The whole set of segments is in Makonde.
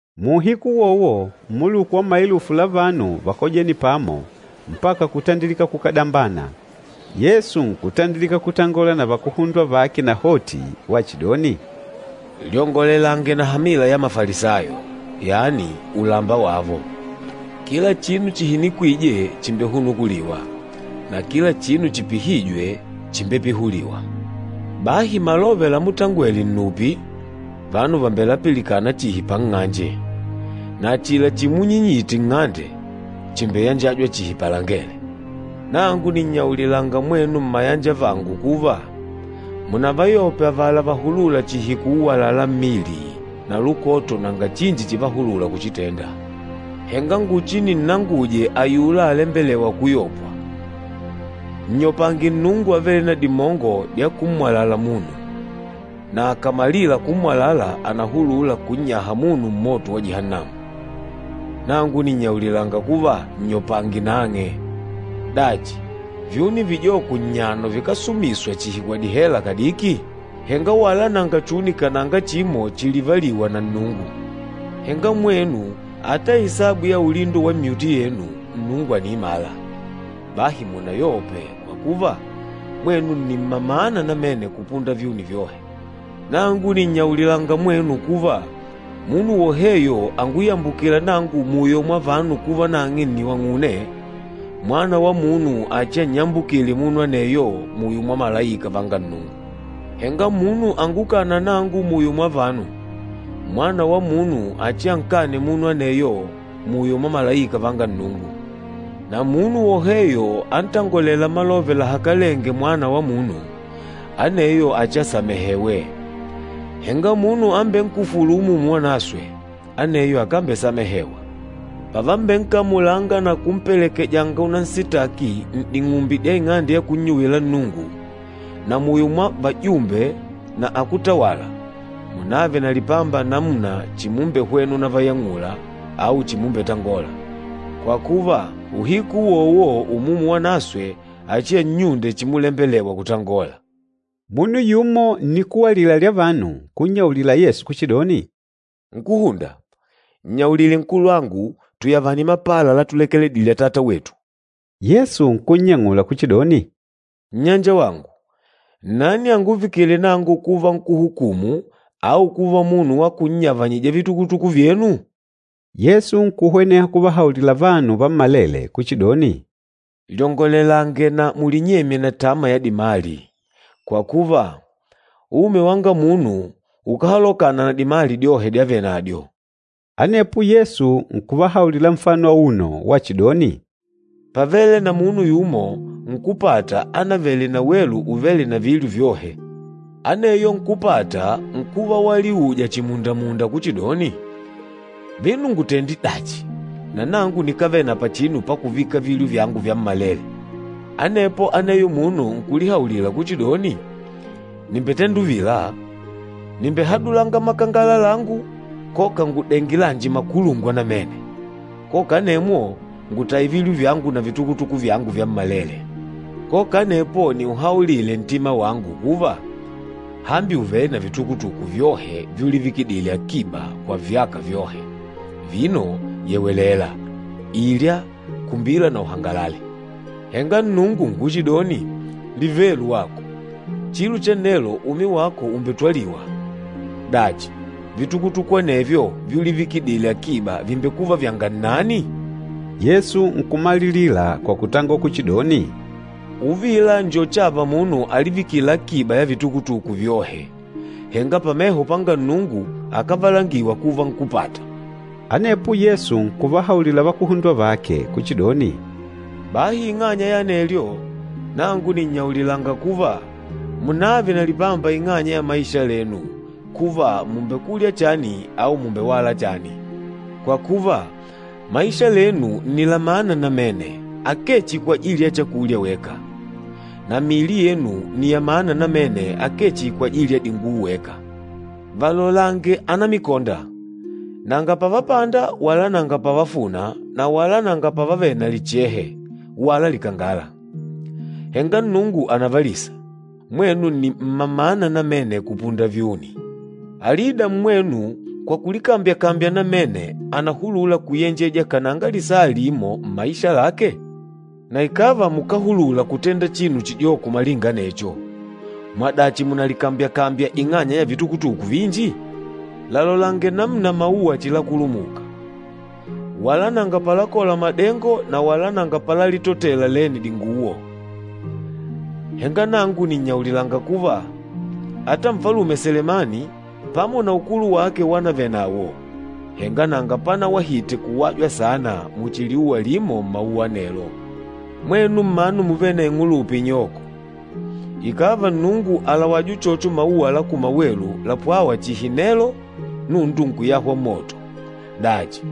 Muuhiku uwowo mmuluku wa maelufu la vanu vákojene pamo mpaka kutandilika kukadambana. Yesu nkutandilika kutangola na vakuhundwa vake nahoti wachidoni, “Lyongolelange na hamila ya Mafalisayo, yani ulamba wavo. Kila chinu chihinikwîje chìmbehunukuliwa, na kila chinu chipihîjwe chìmbepihuliwa. Bahi malove lamutangwele nnupi, vanu vàmbelapilikana chihi panng'anje, na achila chimunyinyite nng'ande, chìmbeyanjajwa chihi palangele. Nangu nìnnyaulilanga mwenu mmayanjavangu kuva, munavayope avala vahulûla chihi kuuwalala mmili na lukoto nanga chinji chívahulùlà kuchitenda. Henga nguchininnanguje ayula alembelêwa kuyopwa, nnyopange Nnungu avêle na dimongo dya kummwalala munu, na akàmalila kummwalala ànahulula kunnyaha munu mmoto wa Jihannamu. Nangu nìnnyaulilanga kuva, nnyopange nang'e. Dachi, vyuni vijoko nnyano vikásumiswa chihi kwa dihela kadiki? Henga wala nanga chuni kananga chimo chilivalîwa na Nnungu. Henga mwenu ata isabu ya ulindo wa myuti yenu Nnungu àniimala. Bahi munayope, kwa kuva, mwenu nni mma maana namene kupunda vyuni vyohe! Nangu nìnnyaulilanga mwenu kuva, munu woheyo anguyambukîla nangu muyo mwa vanu kuva nang'e nni wang'une, Mwana wa Munu achiannyambukile munu aneyo muyo mwa malaika vanga Nnungu. Henga munu angukâna nangu muyo mwa vanu, Mwana wa Munu achiankane munu aneyo muyo mwa malaika vanga Nnungu. Na munu woheyo antangolêla malove lahakalenge Mwana wa Munu, aneyo achiasamehewe. Henga munu ambenkufûlu Umumu Wanaswe, aneyo akambesamehewa. Pavambenkamulanga na kumpelekejanga unansitaki n'ding'umbi dya ing'ande ya kunnyuwila Nnungu na muyo mwa vajumbe na akútawala, munave na lipamba namuna chimumbehwena unayang'ula au chimumbetangola. Kwa kuva, uhiku uwowo Umumu Wanaswe achiannyunde chimulembelewa kutangola.” Munu yumo nnikuwa alila lya vanu, nkunnyaulila Yesu kuchidoni, “Nkúhunda, nnyaulile nkulwangu tuyavane mapala latulekedile atata wetu.” Yesu nkunnyang'ula kuchidoni, “Nnyanjawangu, nnani anguvikîle nangu kuva nkúhukumu au kuva munu wa kunnyavanyija vitukutuku vyenu?” Yesu nkuhweneha kuvahaulila vanu vammalele kuchidoni, “Lyongolelange na mulinyemye na tama ya dimali, kwa kuva, umi wanga munu ukáhalokana na dimali dyohe dyavenadyo.” Anepo Yesu nkuvahaulila nfano auno wachidoni, “Pávele na munu yumo nkúpata ánavele na welu uvêle vilyo vyohe. Aneyo nkúpata nkuva waliuja chimundamunda kuchidoni, ‘Vino ngutende dachi na nangu nikávele na pachinu pakuvika vilyo vyangu vyammalele?’ Anepo aneyo munu nkulihaulila kuchidoni, ‘Nìmbetenda uvila, nìmbehadulanga makangala langu, koka ngudenge lanji makulungwa namene, koka anemwo ngutaye vilyo vyangu na vitukutuku vyangu vyammalele. Koka anepo niuhaulile ntima wangu kuva, hambi ùvele na vitukutuku vyohe vyulivikidile akiba kwa vyaka vyohe, vino yewelela, ilya, kumbila na uhangalale.’ Henga Nnungu nkuchidoni, ‘Livelu wako, chilo chanelo umi wako ùmbetwaliwa. Dachi, vitukutuku anevyo vyulivikidile akiba vìmbekuva vyanga nnani?’” Yesu nkumalilila kwa kutangola kuchidoni, “Uvila njo chava munu alivikîla akiba ya vitukutuku vyohe, henga pameho panga Nnungu akávalangiwa kuva nkúpata.” Anepo Yesu nkuvahaulila vakuhundwa vake kuchidoni, “Bahi ing'anya ya anelyo, nangu nìnnyaulilanga kuva, munààve na lipamba ing'anya ya maisha lenu, kuva mùmbekulya chani au mùmbewala chani. Kwa kuva, maisha lenu nni la mana namene, akee chihi kwajili ya chakulya weka. Na miili yenu nni ya mana namene akee chihi kwajili ya dinguwo weka. Valolange anamikonda, nanga pavapanda wala nanga pavafuna na wala nanga pavavele na lichehe wala likangala. Henga Nnungu ànavalisa. Mwenu ni mma mana namene kupunda vyuni! Alida mmwenu kwa kulikambya-kambya namene ànahulula kuyenjeja kananga lisaa limo mmaisha lake? Na ikàva mukáhulula kutenda chinu chijoko malinga anecho, mwadachi mùnalikambyakambya ing'anya ya vitukutuku vinji? Lalolange namuna mauwa chilakulumuka. Wala nanga palakola madengo na wala nanga palalitotela lene dinguwo. Henga nangu nìnnyaulilanga kuva, ata Nfalume Selemani pamo na ukulu wake wanavele nawo, henga nanga panawahite kuwajwa saana muchi liuwa limo mmauwa anelo. Mwenu mmanu muvêle na ing'ulupa inyoko, ikàva Nnungu àlawaja uchocho mauwa la kumawelu lapwâwa chihi nelo, nundu nkuyahwa mmoto, dachi,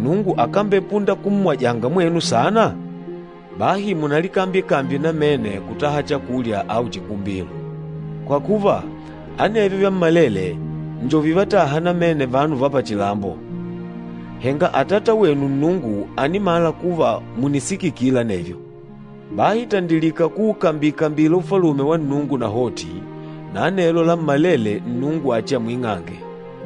Nnungu akambepunda kummwajanga mwenu saana? Bahi munalikambyekambye namene kutaha chakulya au chikumbilo. Kwa kuva, anevyo vyammalele njo vivátàhà namene vanu va pachilambo. Henga Atata wenu Nnungu ànimala kuva mùnisikikila anevyo. Bahi tandilika kuukambi-kambila Ufalume wa Nnungu nahoti, na anelo lammalele Nnungu achiamwing'ange.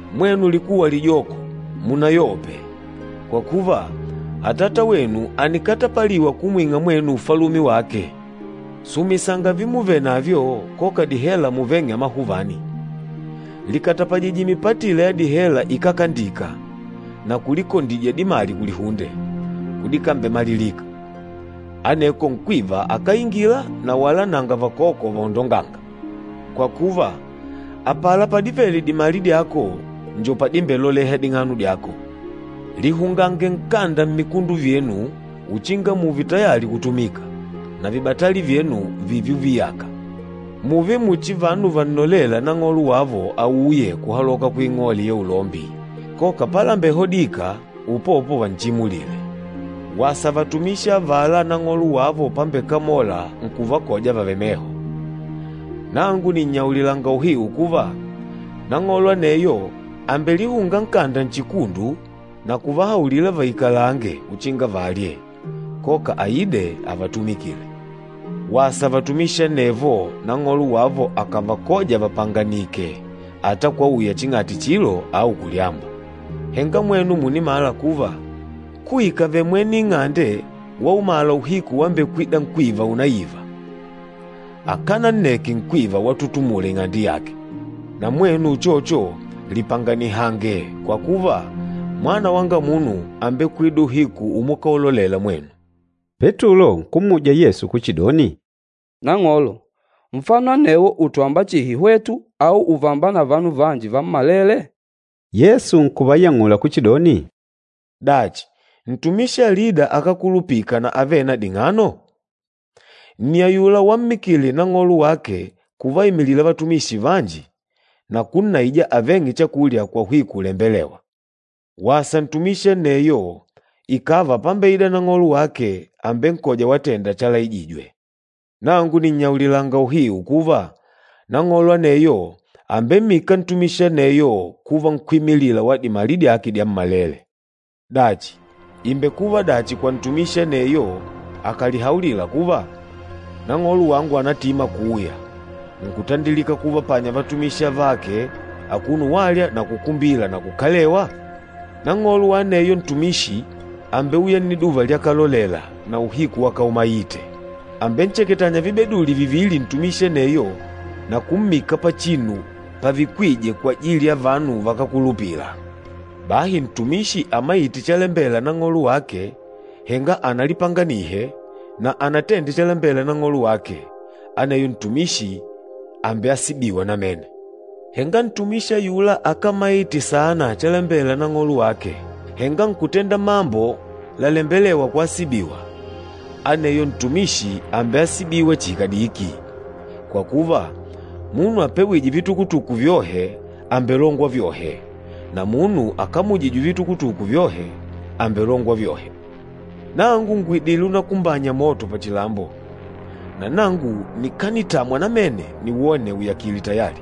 Mwenu likuwa lijoko, munayope! Kwa kuva, Atata wenu ànikatapaliwa kumwing'a mwenu Ufalume wake. Sumisanga vimuvenavyo koka dihela muveng'e amahuvani. Likatapajije mipatila ya dihela ikákandika, na kulikondidya dimali kulihunde, kudikambemalilika. Aneko nkwiva akáingila na wala nanga vakoko vaondongânga. Kwa kuva, apala padivele dimali dyako njo padimbeloleha ding'ano dyako.” “Lihungange nkanda mmikundu vyenu uchinga mùùve tayali kutumika, na vibatali vyenu vììve uviyaka. Mùùve muchi vanu vannolêla nang'olo wavo auye kuhaloka kuing'ole ya ulombi koka palambehodika, upopo vanchimulile. Wasa vatumishi avala Nang'olo wavo pambekamola nkuvakoja vavèlè meho! Nangu nìnnyaulilanga uhiu kuva, nang'olo aneyo àmbelihunga nkanda nchikundu na kuvahaulila vaikalange uchinga valye, koka aide avatumikile. Wasa vatumishi anevo, nang'olo wavo akàvakoja vapanganìkè ata kwauya ching'ati chilo au kulyamba! Henga mwenu mùnimala kuva, kuikave mwene ing'ande waumala uhiku wambekwida nkwiva unaiva, akánanneke nkwiva watutumula ing'ande yake. Na mwenu uchocho, lipanganihange kwa kuva, Mwana wanga Munu àmbekwida uhiku umukalolela mwenu.” Petulo nkummuja Yesu kuchidoni, “Nang'olo, nfano anewo ùtwamba chihi hwetu au ùvamba na vanu vanji vammalele?” Yesu nkuyang'ula kuchidoni, “Dachi, ntumishi alida akulupîka na avêle na ding'ano? Nni ayula wammikile nang'olo wake kuvaimilila vatumishi vanji na kunnaija aveng'e chakulya kwa uhiku ulembelêwa. Wasa ntumishi aneyo ikàva pambeida nang'olo wake àmbenkoja watenda chalaijijwe. Nangu nìnnyaulilanga uhiu kuva, nang'olo aneyo àmbemmika ntumishi aneyo kuva nkwímilila wa dimali dyake dyammalele. Dachi, ìmbekuva dachi kwa ntumishi aneyo akàlihaulila kuva, ‘Nang'olo wangu ànatima kuuya,’ nkutandilika kuvapanya vatumishi avake akuno walya na kukumbila na kukalewa? Nang'olo wa aneyo ntumishi àmbeuya nniduva lyakalolela na uhiku wakaumaite. Àmbencheketanya vibeduli vivili ntumishi aneyo na kummika pachinu pavikwîje kwajili ya vanu vakákulupila. Bahi ntumishi amaîte chalembela nang'olo wake, henga analipanganihe, na anatende chalembela nang'olo wake, aneyo ntumishi àmbeasibiwa namene. Henga ntumishi ayula akámaite saana chalembela nang'olo wake, henga nkutenda mambo lalembelêwa kuasibiwa, aneyo ntumishi àmbeasibiwa chihi kadiki. Kwa kuva, munu apewîje vitukutuku vyohe àmbelongwa vyohe, na munu akamujîjwe vitukutuku vyohe, àmbelongwa vyohe.” “Nangu ngùidile unakumbanya moto pachilambo, na nangu nikanitamwa namene niwone uyakile tayali!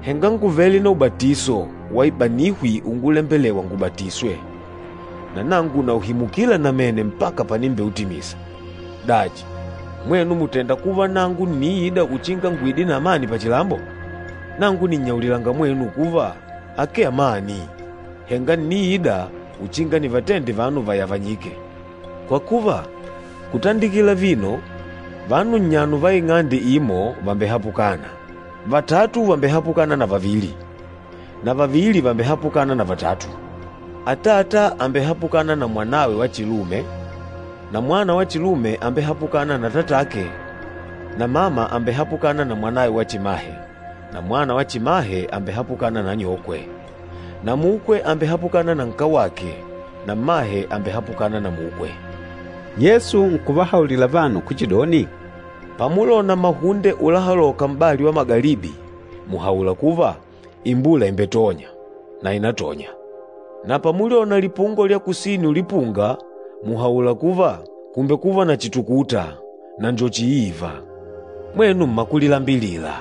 Henga ngùvele na ubatiso wa ibanihwi ungulembelewa ngubatiswe, na nangu nauhimukila namene mpaka panimbeutimisa. Dachi, mwenu mùtenda kuva nangu ǹniida uchinga nguide na amani pachilambo? Nangu nìnnyaulilanga mwenu kuva, akee amani, henga ǹniida uchinga nivatende vanu vayavanyike. Kwa kuva, kutandikila vino, vanu nnyano va ing'ande imo vàmbehapukana, vatatu vàmbehapukana na vavili na vavili vàmbehapukana na vatatu. Atata àmbehapukana na mwanawe wa chilume, na mwana wa chilume àmbehapukana na atatake na mama àmbehapukana na mwanawe wa chimahe na mwana wa chimahe àmbehapukana na anyokwe, na mukwe àmbehapukana na nkawake na mmahe àmbehapukana na mukwe.” Yesu nkuvahaulila vanu kuchidoni, “Pamulona mahunde ulahaloka m'bali wa kundonde, mùhaula kuva, ‘Imbula ìmbetonya,’ na ìnatonya. Na pamulyona lipungo lya kusini ulipunga, mùhaula kuva, ‘Kùmbekuva na chitukuta,’ na njo chiiva. Mwenu mmakulilambilila!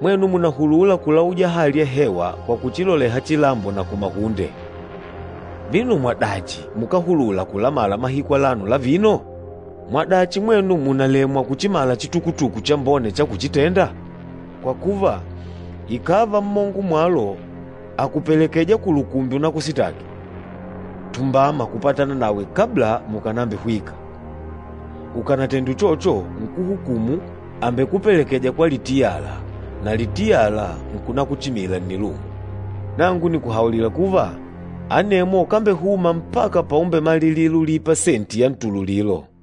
Mwenu mùnahulula kulauja hali ya hewa kwa kuchiloleha chilambo na kumahunde, vino mwadachi mukáhulula kulamala mahiku alano la vino?” “Mwadachi mwenu mùnalemwa kuchimala chitukutuku chambone cha kuchitenda? Kwa kuva, ikàva mmongo mwalo àkupelekeja kulukumbi unakusitaki, tumbama kupatana nawe kabla mukànambihwika, ukanatende uchocho nkúhukumu àmbekupelekeja kwa litiyala, na litiyala nkunakuchimila nnilungu. Nangu nìkuhaulila kuva, anemwo ukambehuma mpaka paumbemalilila ulipa senti ya ntululilo.”